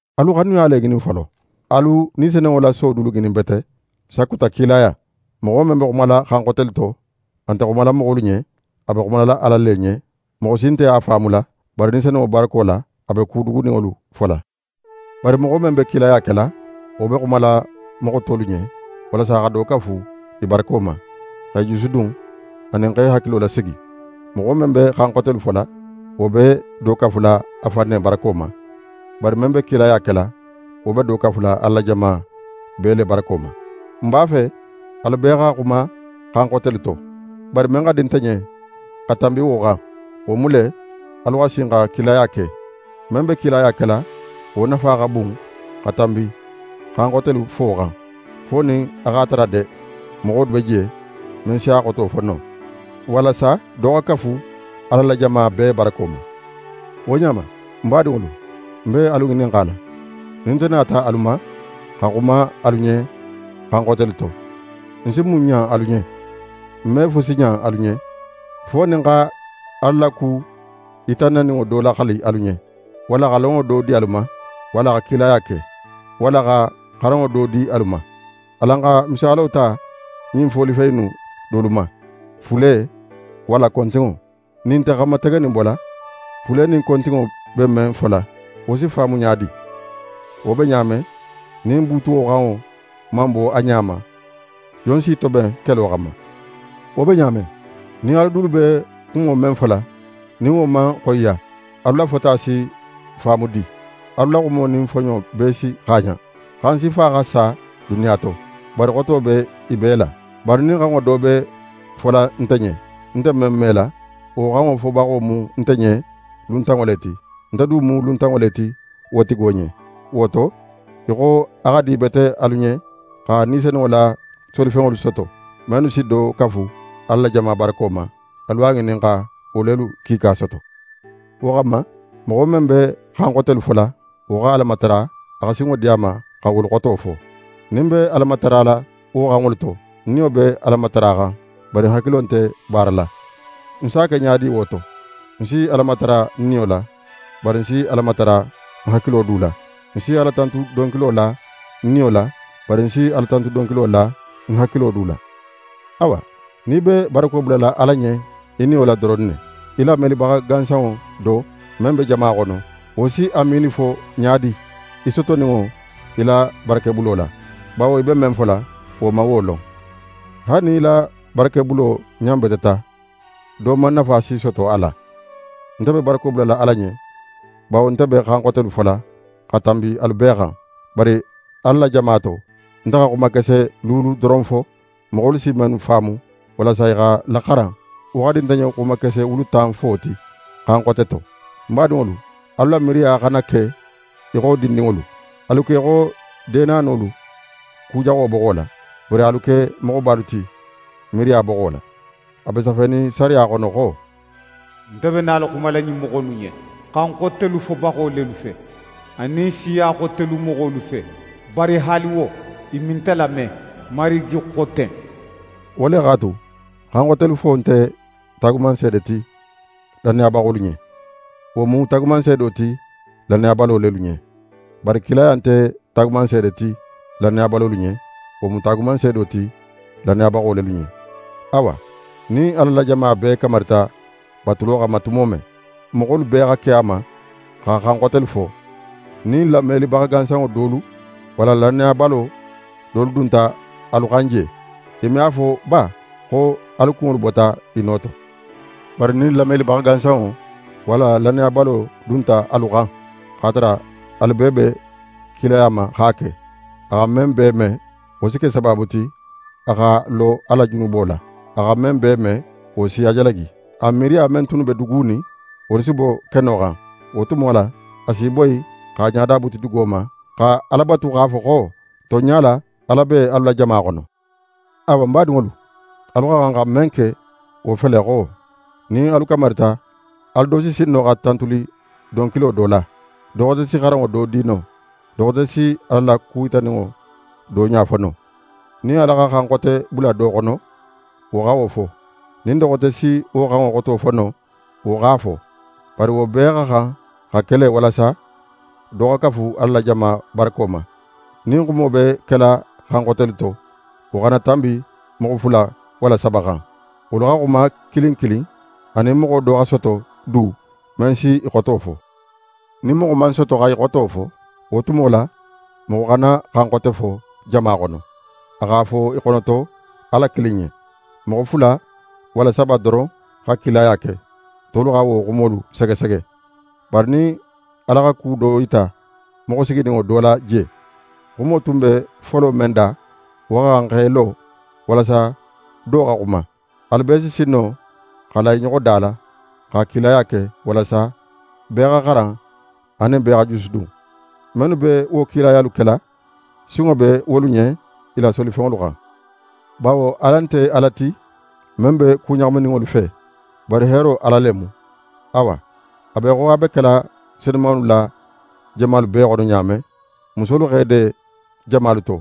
Alu xanuya le ŋinin folo. Alu Ni Senunŋo la so dulu ŋinin bete, sakuta kilaya. Moxo men be xumala xan xotelu to, a nte xumala moxolu ɲen, a be xumala Ala le ɲen. Moxo si nte a faamula, bari Ni Senunŋo barako la, a be ku duguninŋolu fola. Bari moxo men be kilaya kela, wo be xumala moxo tolu ɲen, walasa xa do kafu i barako ma, x'e jusudun, anin x'e hakilo lasigi. Moxo men be xan xotelu fola, wo be do kafula a fan ne barako ma; bari men be kilaya kela, wo be do kafula Ala la jama bee le barako ma. Ń b'a fe alu bee xa xuma xan xotelu to. Bari men xa di nte ɲen xa tanbi wo xan, wo mu le, alu xa sin xa kilaya ke. Men be kilaya kela, wo nafa xa bun xa tanbi xan xotelu fo xan, fo nin a x'a tara de moxo be je men si a xoto fo no, walasa do xa kafu Ala la jama bee barako ma. Wo ɲa ma, ń badinŋolu, ń be alu ŋininxala, nin nte nata alu ma, xa xuma alu ɲen xan xotelu to, ń si mun ɲan alu ɲen? Ń me fusi ɲan alu ɲen, fo nin ń xa Ala la ku yitannaninŋo do laxali alu ɲen, walla xa lonŋo do di alu ma, walla xa kilaya ke, walla xa xaranŋo do di alu ma. Alan xa misaalo ta ɲin folifen innu dolu ma, fule, walla kontinŋo: Nin i nte xan mategenin bola, fule nin kontinŋo be men fola, wo si faamu ɲa di? Wo be ɲa men, nin buutuwo xanŋo man bo a ɲa ma, jon si í toben kelo xanma? Wo be ɲa men, nin alu dulu be xumo men fola, nin wo man xoyiya, alu la fota si faamu di? Alu la xumo nin foɲo bee si xaaɲan. Xan sifa xa sa duniya to; bari xoto be i bee la. Bari nin xanŋo do be fola nte ɲen, ń nte men mela, wo xanŋo fobaxo mu nte ɲen luntanŋo le ti, nte du mu luntanŋo le ti wo tigo ɲen. Wo to, í xo a xa dibete alu ɲen xa Ni Senunŋo la solifenŋolu soto, mennu si do kafu Ala la jama barako ma, alu a ŋinin xa wo lelu kiika soto. Wo xanma, moxo men be xan xotelu fola, wo xa Ala matara a xa sinŋo di a ma xa wolu xoto fo. Nin ń be Ala matarala wo xanŋolu to, ń niyo be Ala mataraxan, bari ń hakilo nte baara la. Ń s'a ke ɲa di wo to? Ń si Ala matara ń niyo la, bari ń si Ala matara ń hakilo du la. Ń si Alatantu donkilo la ń niyo la, bari ń si Alatantu donkilo la ń hakilo du la. Awa, nin í be barako bulala Ala ɲen í niyo la doron ne, í lamelibaxa gansanŋo do, men be jama xono, wo si “Amiini” fo ɲa di í sotoninŋo í la barakebulo la? Bawo í be men fola, wo man wo lon. Haali nin í la barakebulo ɲanbeteta, do man nafa si soto a la. Nte be barako bulala Ala ɲen, bawo nte be xan xotelu fola xa tanbi alu bee xan. Bari Ala la jama to, nte xa xumakese luulu doron fo, moxolu si mennu faamu, walasa i xa laxaran, wo xa di nte ɲen xumakese wulu tan fo ti xan xote to. Ń badinŋolu, alu la miiriya xana ke í xo dindinŋolu; alu ke í xo deenanolu, ku jaxo boxo la; bari alu ke moxobalu ti, miiriya boxo la. A be safenin sariya xono xo: «Nte be nala xumala ɲin moxo innu ɲen xan xotelu fobaxo lelu fe anin siya xotelu moxolu fe. Bari haali wo, i me nte lame, Marigi xo ten.» Wo le x'a tu, xan xotelu fo nte taagumanseede ti lannayabaxolu ɲen; wo mu taagumanseedo ti lannayabalo lelu ɲen. Bari kilaya nte taagumanseede ti lannayabalolu ɲen; wo mu taagumanseedo ti lannayabaxo lelu ɲen. Awa, nin Ala la jama bee kamarita batulo xanma tumo men, moxolu bee xa ke a ma xa xan xotelu fo, nin lamelibaxa gansanŋo dolu walla lannayabalo dolu dunta alu xan je, i me a fo ba xo alu kunŋolu bota i no to? Bari nin lamelibaxa gansanŋo walla lannayabalo dunta alu xan, x'a tara alu bee be kilaya ma x'a ke, a xa men bee me, wo si ke sabaabu ti, a xa lo a la junubo la. A xa men bee me, wo si a jalagi. A miiriya men tunnu be dugunin, wolu si bo keno xan. Wo tumo la, a si í boyi x'a ɲada buti dugo ma, xa Ala batu x'a fo xo: «Tonɲa la, Ala be alu la jama xono.» Awa, ń badinŋolu, alu xa xan xa men ke wo fele xo: Nin alu kamarita, alu do si sin no xa tantuli donkilo do la, do xote si xaranŋo do di no, do xote si Ala la ku yitaninŋo do ɲa fo no. Nin Ala xa xan xote bula do xono, wo xa wo fo; nin do xote si wo xanŋo xoto fo no, wo x'a fo. Bari wo bee xa xan xa ke le walasa do xa kafu Ala la jama barako ma. Nin xumo be kela xan xotelu to, wo xana tanbi moxo fula walla saba xan. Wolu xa xuma kilin kilin, anin moxo do xa soto du, men si i xoto fo. Nin moxo man soto xa i xoto fo, wo tumo la, moxo xana xan xote fo jama xono, a x'a fo í xonoto Ala kilin ɲen. Moxo fula walla saba doron xa kilaya ke, tolu xa wo xumolu segesege. Bari nin Ala xa ku do yita moxo sigininŋo do la je, xumo tun be folo men da, wo xa xan x'é lo, walasa do in xa xuma. Alu bee si sin no xa la i ɲoxo da la, xa kilaya ke, walasa bee xa xaran anin bee xa jusudun. Mennu be wo kilayalu kela, sinŋo be wolu ɲen i la solifenŋolu xan. Bawo Ala nte Ala ti, men be ku ɲaxamininŋolu fe, bari heero Ala le mu. Awa, a be í xo a be kela senumanŋolu la jamalu bee xono ɲa men, musolu x'e de jamalu to.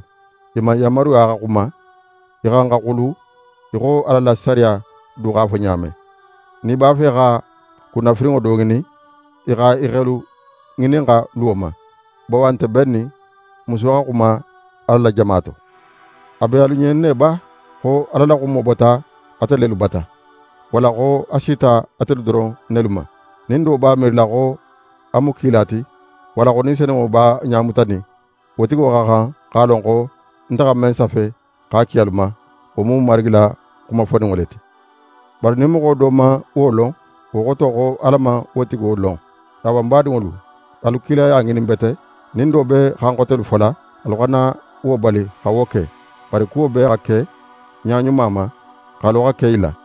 I man yanmaru xa xuma. I xa xan xa xulu í xo Ala la sariya du x'a fo ɲa men. Nin i b'a fe xa kunnafirinŋo do ŋinin, i xa i xelu ŋininxa luwo ma; bawo a nte bennin muso xa xuma Ala la jama to. A be alu ɲen ne ba xo Ala la xumo bota ate lelu bata? Walla xo a sita atelu doron nelu ma? Nin do b'a miirila xo a mu kila ti, walla xo Ni Senunŋo b'a ɲamutanin, wo tigo xa xan x'a lon xo nte xa men safe x'a ki alu ma, wo mu Marigi la xuma foninŋo le ti. Bari nin moxo do man wo lon, wo xoto xo Ala man wo tigo lon. Awa, ń badinŋolu, alu kilaya ŋinin bete. Nin do be xan xotelu fola, alu xana wo bali xa wo ke. Bari kuwo bee xa ke ɲa ɲuma ma, xalo xa ke i la.